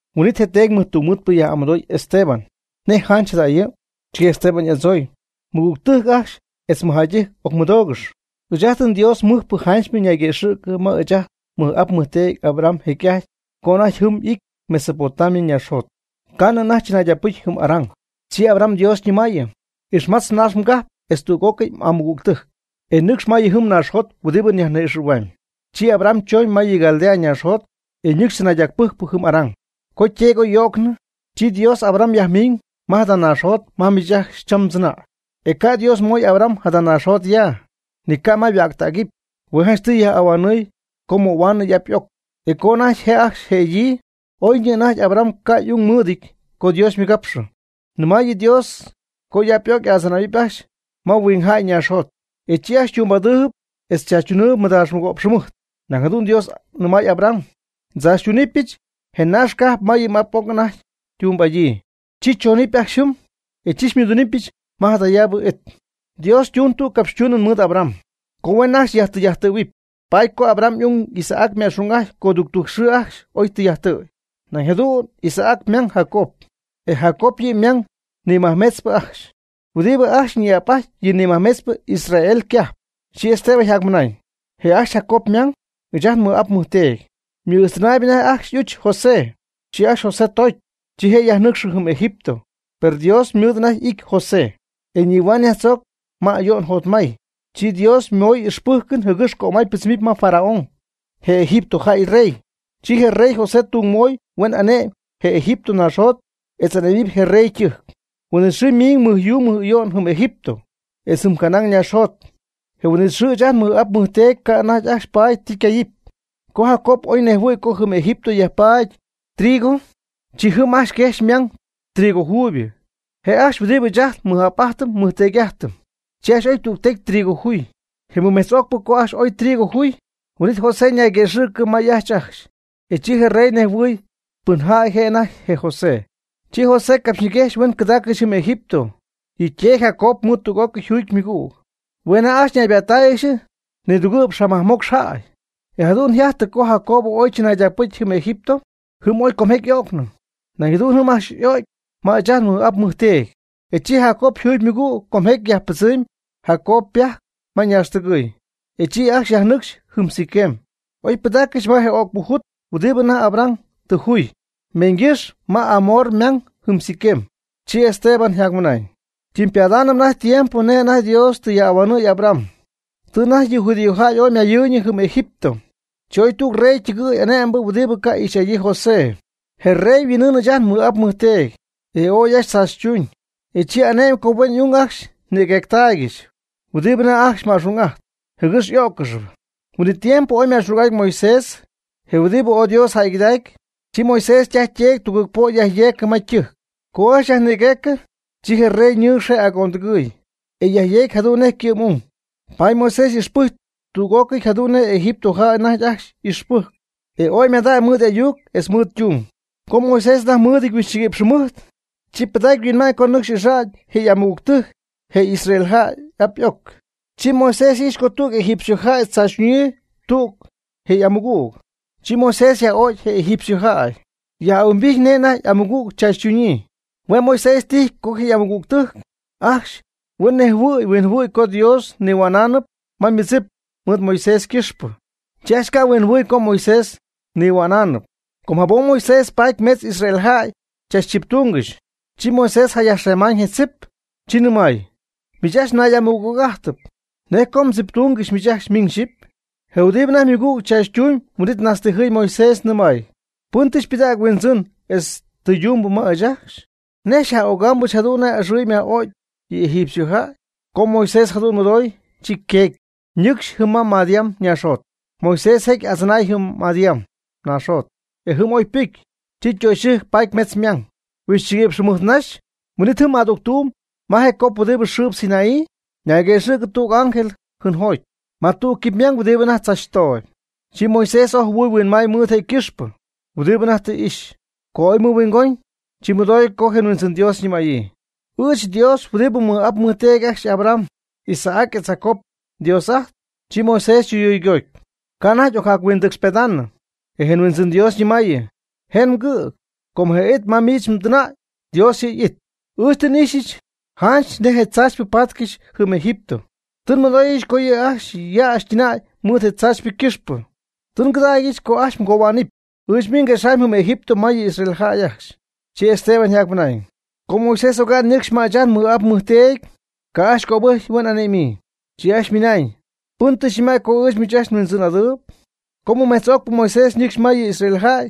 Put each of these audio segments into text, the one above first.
Huin'it je teedy mɨjtungmɨɨdpɨ yaj'amɨdooy Esteban: ―¿Nej janch jadajɨ? Chi Esteban y'adzooy: ―Mɨgügtɨjc ajcxy etz mɨjjäydɨjc ocmɨdoogɨx. Ɨɨch ajt nDios mɨjpɨ janchypɨ nayquëxɨ̈cɨ ma ɨɨch ajt nmɨj'ap nmɨjteedy Abraham jecy'ajty co anajty jɨm ity Mesopotamia ñaaxjot, ca'nɨ anajty chɨnaydacpɨcy jɨm Harán. Chi Abraham Dios ñɨmaayɨ: “Ixmatz mnaax mgajp etz tüg'ócɨy m'amɨgügtɨjc, e nɨcx ma yɨ naaxjot huɨdibɨ myajnïxɨ̈huamyb.” Chi Abraham chooñ ma yɨ Caldea ñaaxjot, e nɨcxy tzɨnaydacpɨjcpɨ jɨm Harán. Co yteedy oy y'o'cnɨ, chi Dios Abraham yajmiiñ ma jada naaxjot ma miich ajcxy cham mdzɨnäy. E ca' Dios moy Abraham jada naaxjot ya, ni ca' ma yhuäcxtägɨpy. Hue' je' janchtɨy yaj'ahuanɨɨy co möhuaanɨɨy y'ap y'oc, e co anajty je' ajcxy jëdɨɨb. Oyñɨ anajty Abraham ca' y'ung mɨɨdɨty co Dios ymɨgapxɨ. Nɨmaayɨ Dios co y'ap y'oc y'adzɨnähuɨpy ajcxy ma huingjäy ñaaxjot, etz chi ajcxy ytumbɨ'adɨɨyb etz chaachytunɨɨyb mɨdaax mɨgo'px jɨmɨjt. Nañ jadu'n Dios nɨmay Abraham: “Ndzaachytunɨpyɨch je naax cajp ma yɨ m'ap m'oc anajty ytumbɨ'adyii. Chi choonɨp ajcxy jɨm, e chi xymɨdunɨpyɨch ma jadayaabɨ it.” Dios ytuun tüg capxytuunɨn mɨɨd Abraham, co huen ajcxy yajtɨy'ajttɨ̈huɨp. Paady co Abraham y'ung Isaac yma'xung'ajty coductujc xɨɨ ajcxy oy tɨy'ajttɨ̈y. Nañ jadu'n Isaac ymang Jacob, e Jacob yɨ ymang nimajmetzpɨ ajcxy, huɨdibɨ ajcxy ñi'ap'ajty yɨ nimajmetzpɨcypɨ Israel ycajp. Chi Esteban yjacmɨnañ: ―Je' ajcxy Jacob ymang, ɨɨch ajt nmɨj'ap nmɨjteedy, ymɨ'ijxtɨnaayb anajty ajcxy y'uch José. Chi ajcxy José toocy, chi je' yajnɨcxɨ jɨm Egipto, per Dios mɨɨd anajty y'ity José, etz nihuaañ yajtzoocy ma ayo'n jotmay. Chi Dios moy ixpɨ́jcɨn jɨgɨx cömay ypɨdzɨmɨpy ma Faraón, je Egipto jäy yrey. Chi je rey José tung moy huen ane'my je Egipto naaxjot etz ane'mɨpy je rey ytɨjc. Huin'it xɨɨ ymiiñ mɨjyuu mɨj'ayo'n jɨm Egipto etz jɨm Canaán ñaaxjot. Je huin'it xɨɨ ɨɨch ajt nmɨj'ap nmɨjteedy ca' anajty ajcxy paady ti ycayɨpy. Co Jacob oy nejhuɨ̈y co jɨm Egipto yajpaady jɨm trigo, chi jɨm quejxy ymang ajcxy trigo juuybɨ. Je' ajcxy huɨdibɨ ɨɨch ajt nmɨj'ap'ajtɨm nmɨjteedy'ajtɨm. Chi ajcxy y'oy tügtecy trigo juuyb. Je mɨmejtz'ocpɨ co ajcxy oy trigo juy, huin'it José ñayñigapxɨ ma y'ajch ajcxy. E chi je rey nejhuɨy pɨnjäy je' anajty je José. Chi José capxyñiguejxy huen cɨdaaccɨxy jɨm Egipto yɨ' yteedy Jacob mɨɨd tüg'ócɨy yjuugy ymɨgüg. Hue' anajty ajcxy ñaybaattáayɨgɨxy nidugɨ'px majmocx jäy. E jadu'n yjajty co Jacobo oy chɨnaydacpɨcy jɨm Egipto. Jɨm oy comjecy y'o'cnɨ. Nañ jadu'n jɨm ajcxy y'o'cy may ɨɨch ajt nmɨj'ap nmɨjteedy. E chi Jacob yjuugy ymɨgüg com jecy yajpɨdzɨmy Jacob ypajc ma ñaaxtɨgɨ̈y, e chi ajcxy yajnɨcxy jɨm Siquem, oy pɨdaaccɨxy ma je o'cpɨ jut huɨdibɨ Abraham anajty tɨ juy meeñygɨ́xy ma Hamor ymang jɨm Siquem. Chi Esteban yjacmɨnañ: ―Ytɨmypadaanɨpy anajty tiempo nej anajty Dios tɨ yaj'ahuanɨ̈y Abraham. Tɨ anajty yɨ judíojäy ooy ymayɨɨyñɨ jɨm Egipto. Chi oy jadüg rey ytɨgɨɨy ane'mbɨ huɨdibɨ ca' ixy'adyii José. Je rey yhuin'ɨɨñ ɨɨch ajt nmɨj'ap nmɨjteedy, e oy ajcxy chaachytuun. E chi ane'my co huen y'ung ajcxy nïguecytaaygɨxy huɨdibɨ anajty ajcxy ma'xung'ajtp, jɨgɨx y'ó'ccɨxɨpy. Huin'it tiempo oy yma'xung'ajty Moisés, je huɨdibɨ ooy Dios jäygɨdacy. Chi Moisés ytaj yteedy tugɨɨg po' yajyeecɨ ma ytɨjc. Co ajcxy yajnïgueecɨ, chi je rey ñɨɨx je' agondɨgɨɨy, e yajyeegy jadu'n nej ycɨ'm'ung. Paady Moisés ixpɨjcy tüg'ócɨy jadu'n nej Egipto jäy anajty ajcxy y'ixpɨcyɨty, e ooy ymadacy mɨɨd y'ayuc etz mɨɨd ytung. Co Moisés anajty mɨɨdɨty huixchɨguïpx jɨmɨjt, chi pɨdacy yhuinma'ñ co nɨcxy ixa'ñ je' y'amɨgügtɨjc je Israel y'ap y'oc. Chi Moisés ijxy co tüg egipciojäy chaachytuñyii tüg je' y'amɨgüg. Chi Moisés yaj'o'cy je egipciojäy, yaj'ahuimbijty nej anajty y'amɨgüg yajtzaachytuñ. Hue' Moisés tijy co je' y'amɨgügtɨjc ajcxy huen nejhuɨ̈y huinjɨhuɨ̈y co Dios nihua'naanɨp ma ymɨdzip mɨɨd Moisés ycɨxpɨ. Chi ajcxy ca' huinjɨhuɨɨy co Moisés nihua'naanɨp. Com jabom Moisés paty mejtz Israel jäy chachtziptungɨxy. Chi Moisés jayajxemaañ je tzip, chi nɨmay: “Miich ajcxy nay'amɨgüg'ajtɨp, ¿nej co mdziptungɨxy miich ajcxy miñ xyɨpy?” Je huɨdibɨ anajty ymɨgüg tzaachytuumb huin'it najtztijɨɨy Moisés, nɨmay: “¿Pɨn tɨ xypɨdägy huindzɨn etz tɨydumbɨ ma ɨɨch ajcxy? ¿Nej xyaj'ögaamɨch jadu'n nej axɨy myaj'o'cy yɨ egipciojäy?” Co Moisés jadu'n mɨdoy, chi yqueegy, ñɨcxy jɨm ma Madián naaxjot. Moisés jecy y'adzɨnaay jɨm Madián naaxjot, e jɨm oy ypɨcy. Chi ytöxyɨjc paty metz ymang. Huixchɨguïpx jɨmɨjt naxy, huin'it jɨm adügtuum ma je cop huɨdibɨ yxɨɨ Sinaí, ñayguëxɨ̈cɨ tüg ángel jɨnjoty ma tüg quipymang huɨdibɨ anajty tzachtooyb. Chi Moisés ooy jɨhuɨɨy huinmaay mɨɨd je' ycɨxpɨ huɨdibɨ anajty y'ijxyp. Co oy mɨhuingoñ, chi mɨdoy co je Huindzɨn Dios ñɨmäyii: “Ɨɨch Dios huɨdibɨ mmɨj'ap mmɨjteedy ajcxy Abraham, Isaac etz Jacobo Dios'ajtpy.” Chi Moisés chɨyuygoty, ca' anajty ocjac-huindɨcxpedaanɨ. E je Huindzɨn Dios nɨmaayɨ: “Jen mgɨ̈g, com je it ma miich mdɨnäy, Dios yɨ' y'it. Ɨɨch tɨ n'ixyɨch njäyɨch nej tzaachypɨ paatcɨxy jɨm Egipto. Tɨ nmɨdooyɨch co yɨ'ajcxy yäxy ytɨnäy mɨɨd je tzaachypɨ ycɨxpɨ. Tɨ ngɨdägyɨch co ajcxy ngohuaanɨp. Ɨɨch miich nguexamyb jɨm Egipto ma yɨ Israel jäy ajcxy.” Chi Esteban yjacmɨnañ: ―Co Moisés oga'n ñɨcxy ma ɨɨch ajt nmɨj'ap nmɨjteedy ca' ajcxy cöbɨjcy huen y'ane'mɨɨyb, chi ajcxy ymɨnañ: “¿Pɨn tɨ xyñɨmäy co ɨɨch miich ajcxy nhuindzɨn'adɨɨyb?” Co mɨmetz'ocpɨ Moisés ñɨcxy ma yɨ Israel jäy,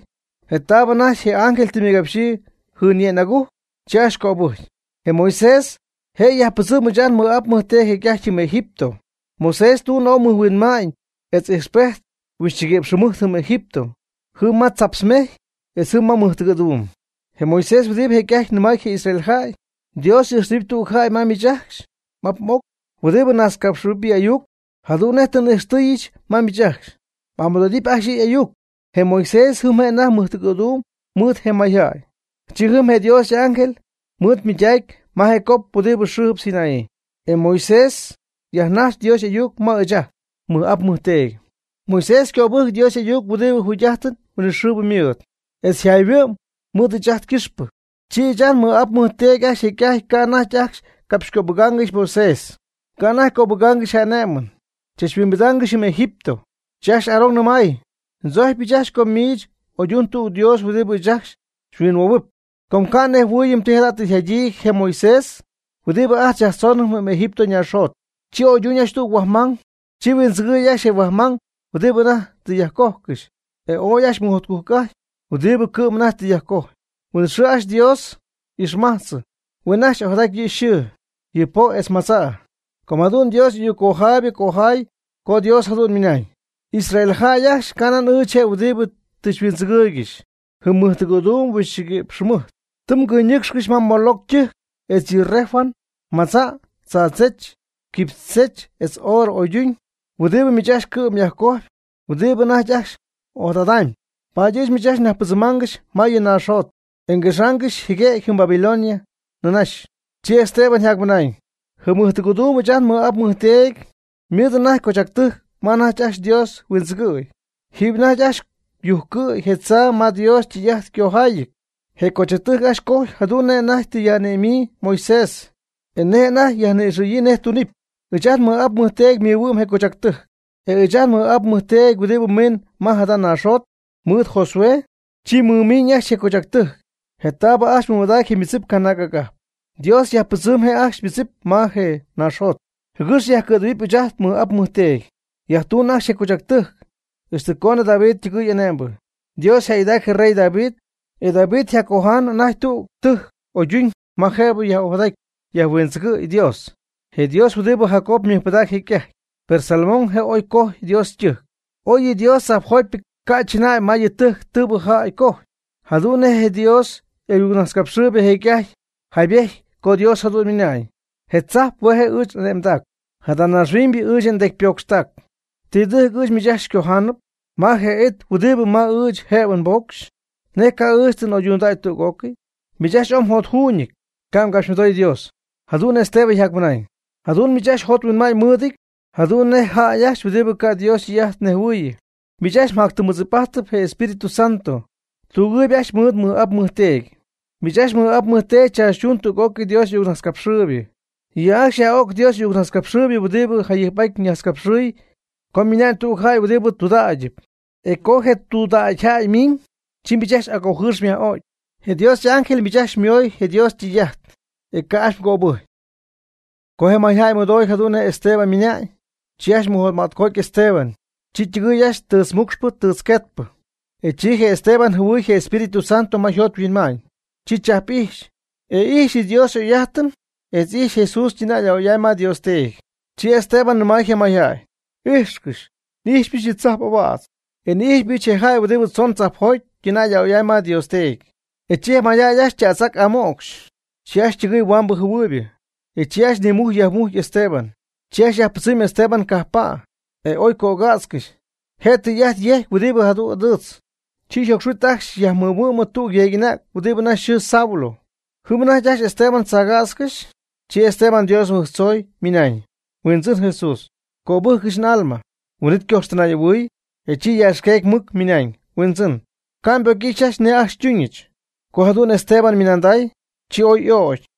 je taabɨ anajty je ángel tɨ ymɨgapxyii jɨnye'ñ agujc, chi ajcxy cöbɨjcy. Je Moisés je' yajpɨdzɨm ɨɨch ajt nmɨj'ap nmɨjteedy jecy'ajty jɨm Egipto. Moisés ytuun oy mɨjhuinma'ñ etz ijxpejt huixchɨguïpx jɨmɨjt jɨm Egipto, jɨm ma tzaptz mejy, etz jɨm ma mɨjtɨgɨ̈duum. Je Moisés huɨdibɨ jecy'ajty nɨmay je Israel jäy: “Dios y'ijxtɨhuɨpy tüg jäy ma miich ajcxy m'ap m'oc huɨdibɨ najtzcapxɨ̈huɨpy yɨ' y'ayuc, jadu'n nej tɨ xy'ijxtɨɨyɨch ma miich ajcxy. M'amɨdo'ijtɨp ajcxy yɨ' y'ayuc.” Je Moisés jɨm je' anajty mɨjtɨgɨ̈duum mɨɨd je mayjäy. Chi jɨm je Dios y'ángel mɨɨd mɨydacy ma je cop huɨdi yxɨɨ Sinaí, etz Moisés yajnajx Dios y'ayuc ma ɨɨch ajt nmɨj'ap nmɨjteedy. Moisés ycöbɨjc Dios y'ayuc huɨdibɨ jugy'ájtɨn huinɨxɨɨbɨ mɨɨd, etz jayhuɨ'my mɨɨd ɨɨch ajt ycɨxpɨ. Chi ɨɨch ajt nmɨj'ap nmɨjteedy ajcxy jecy'ajtpy ca' anajty ajcxy capxcöbɨgaangɨxy Moisés, ca' anajty cöbɨjccɨxy je' y'ané'mɨn, chachhuimbidaangɨxy jɨm Egipto. Chi ajcxy Aarón nɨmay: “Ndzojcypɨch ajcxy co miich oydun tüg Dios huɨdibɨ ɨɨch ajcxy xyhuinhuoohuɨp, com ca' nnejhuɨɨyɨm ti jada' tɨ yjadyii je Moisés huɨdibɨ ajt xyajtzoonɨm Egipto ñaaxjot.” Chi oyduñ ajcxy tüg huajmang. Chi huindzɨgɨɨy ajcxy je huajmang huɨdibɨ anajty tɨ yajcojcɨxy, e ooy ajcxy mɨjotcujc'ajty huɨdibɨ cɨ'm anajty tɨ yajcojy. Huin'it xɨɨ ajcxy Dios y'ixmajtzɨ, huen ajcxy ojadaty yɨ xɨɨ, yɨ po' etz madza'. Com jadu'n Dios y'ayuc cojaaybɨ cojaay co Dios jadu'n ymɨnañ: Israel jäy ajcxy canan ɨɨch je' huɨdibɨ tɨ mhuindzɨgɨɨygɨxy jɨm mɨjtɨgɨ̈duum huixchɨguïpx jɨmɨjt. Tɨ mgɨynɨ́cxcɨxy Moloc ytɨjc etz yɨ Renfán ymadza', tzadzech, quipychech etz oorɨ oyduñ huɨdibɨ miich ajcxy cɨ'm myajcoj huɨdibɨ anajty ajcxy m'ojadadamy. Paady ɨɨch miich ajcxy nyajpɨdzɨmaangɨxy ma yɨ mnaaxjot, e nguexaangɨxy jɨguem jɨm Babilonia nïnaxy. Chi Esteban yjacmɨnañ: ―Jɨm mɨjtɨgɨ̈duum ɨɨch ajt nmɨj'ap nmɨjteedy ymɨɨd anajty cochactɨjc ma anajty ajcxy Dios huindzɨgɨ̈y. Jiiby anajty ajcxy yujccɨ̈y je tzaa ma Dios ytɨy'ajt ycojaayɨty. Je cochactɨjc ajcxy ycoj jadu'n nej anajty tɨ yaj'ane'myii Moisés, e nej anajty yajni'ixɨ̈yii nej tunɨpy. Ɨɨch ajt nmɨj'ap nmɨjteedy mɨhuɨ'm je cochactɨjc, e ɨɨch ajt nmɨj'ap nmɨjteedy huɨdibɨ miiñ ma jada naaxjot mɨɨd Josué, chi mɨmiiñ ajcxy je cochactɨjc je taab ajcxy mɨmadacy je ymɨdzip canaag'agajp. Dios yajpɨdzɨm je' ajcxy ymɨdzip ma je naaxjot, jɨgɨx yajcɨ̈dɨgɨ̈huɨp ɨɨch ajt nmɨj'ap nmɨjteedy. Yajtuuñ ajcxy je cochactɨjc, ixtɨ coonɨ David ytɨgɨɨy ane'mbɨ. Dios yjäygɨdaac je rey David, e David yjacoja'ñ anajty tüg tɨjc oyduñ ma jëbɨ yaj'ojadaty yajhuindzɨgɨɨy Dios, je Dios huɨdi Jacob mɨjpɨdac jecy'ajty. Per Salomón je' oy cojy Dios ytɨjc. Oy yɨ Dios tzajpjotypɨ ca' chɨnäy ma yɨ tɨjc tɨɨbɨ jäy cojy. Jadu'n nej je Dios y'ayucnajtzcapxɨɨybɨ jecy'ajty jaybety co Dios jadu'n ymɨnañ: Je tzajp hue' je' ɨɨch n'ane'mdac, jada naaxhuiñybɨ ɨɨch ndecypocxtac. ¿Ti tɨjc ɨɨch miich ajcxy xycojaanɨp? ¿Ma je it huɨdibɨ it ma ɨɨch jëbɨ nbocxy? ¿Nej cay ɨɨch tɨ n'oydundäy tüg'ócɨy? Miich ajcxy ooy mjotjuuñɨty, ca' mgapxymɨdoy Dios. Jadu'n Esteban yjacmɨnaañ: ―Jadu'n miich ajcxy mjot mhuinma'ñ mɨɨdɨty jadu'n nej jäy ajcxy huɨdibɨ ca' Dios ytɨy'ajt nejhuɨɨyɨ. Miich ajcxy játyɨm mɨdzip'ajtpy je Espíritu Santo. Mdügɨɨyb ajcxy mɨɨd mmɨj'ap mmɨjteedy. Miich ajcxy mmɨj'ap mmɨjteedy chaachytuun tüg'ócɨy Dios y'ayucnajtzcapxɨɨybɨ. Yɨ' ajcxy yaj'o'c Dios y'ayucnajtzcapxɨɨybɨ huɨdibɨ jayɨjp'aty najtzcapxɨɨy co ymina'ñ tüg jäy huɨdibɨ tudägyɨp. E co je tudägy jäy ymiiñ, chi miich ajcxy agojɨɨx myaj'o'cy. Je Dios y'ángel miich ajcxy xymooy je Dios ytɨy'ajt, e ca' ajcxy mgöbɨjcy. Co je mayjäy mɨdoy jadu'n nej Esteban ymɨnañ, chi ajcxy mɨjotmätcoty Esteban, chi ytɨgɨɨy ajcxy tɨɨtzmucxpɨ tɨɨtzqueetpɨ. E chi je Esteban jɨhuɨy je Espíritu Santo ma yjot yhuinma'ñ, chi chajp'ijxy, e ijxy yɨ Dios y'oy'ájtɨn etz ijxy Jesús ytɨnäy a'oy'amy ma Dios Teedy. Chi Esteban nɨmay je mayjäy: ―¡Ijxcɨx! N'ijxypɨch yɨ tzajp ahuädz, e n'ijxypɨch je jäy huɨdibɨ tzoon tzajpjoty ytɨnäy a'oy'amy ma Dios Teedy. E chi je mayjäy ajcxy ytätz'ac amo'cxy, chi ajcxy ytɨgɨɨy huambɨ jɨhuɨɨybɨ, e chi ajcxy nimujcy yajmujcy Esteban. Chi ajcxy yajpɨdzɨmy Esteban cajppa', je' oy cögätzcɨxy. Je tɨy'ajt yejcpɨ huɨdibɨ jadu'n ɨdɨɨtz, chi yjocxhuit ajcxy yajmɨhuɨ'my tüg yeeg'anäg huɨdibɨ anajty yxɨɨ Saulo. Jɨm anajty ajcxy Esteban tzachcätzcɨxy. Chi Esteban Dios mɨbɨjctzoy, ymɨnañ: ―Huindzɨn Jesús, cöbɨ́jcɨgɨch n'alma. Huin'it ycoxtɨnay'ahuɨɨy, e chi yaaxqueegy mɨc ymɨnañ: ―Huindzɨn, ca' mbocy ixɨpy nej ajcxy xytuñɨch. Co jadu'n Esteban ymɨnanday, chi oy y'ögy.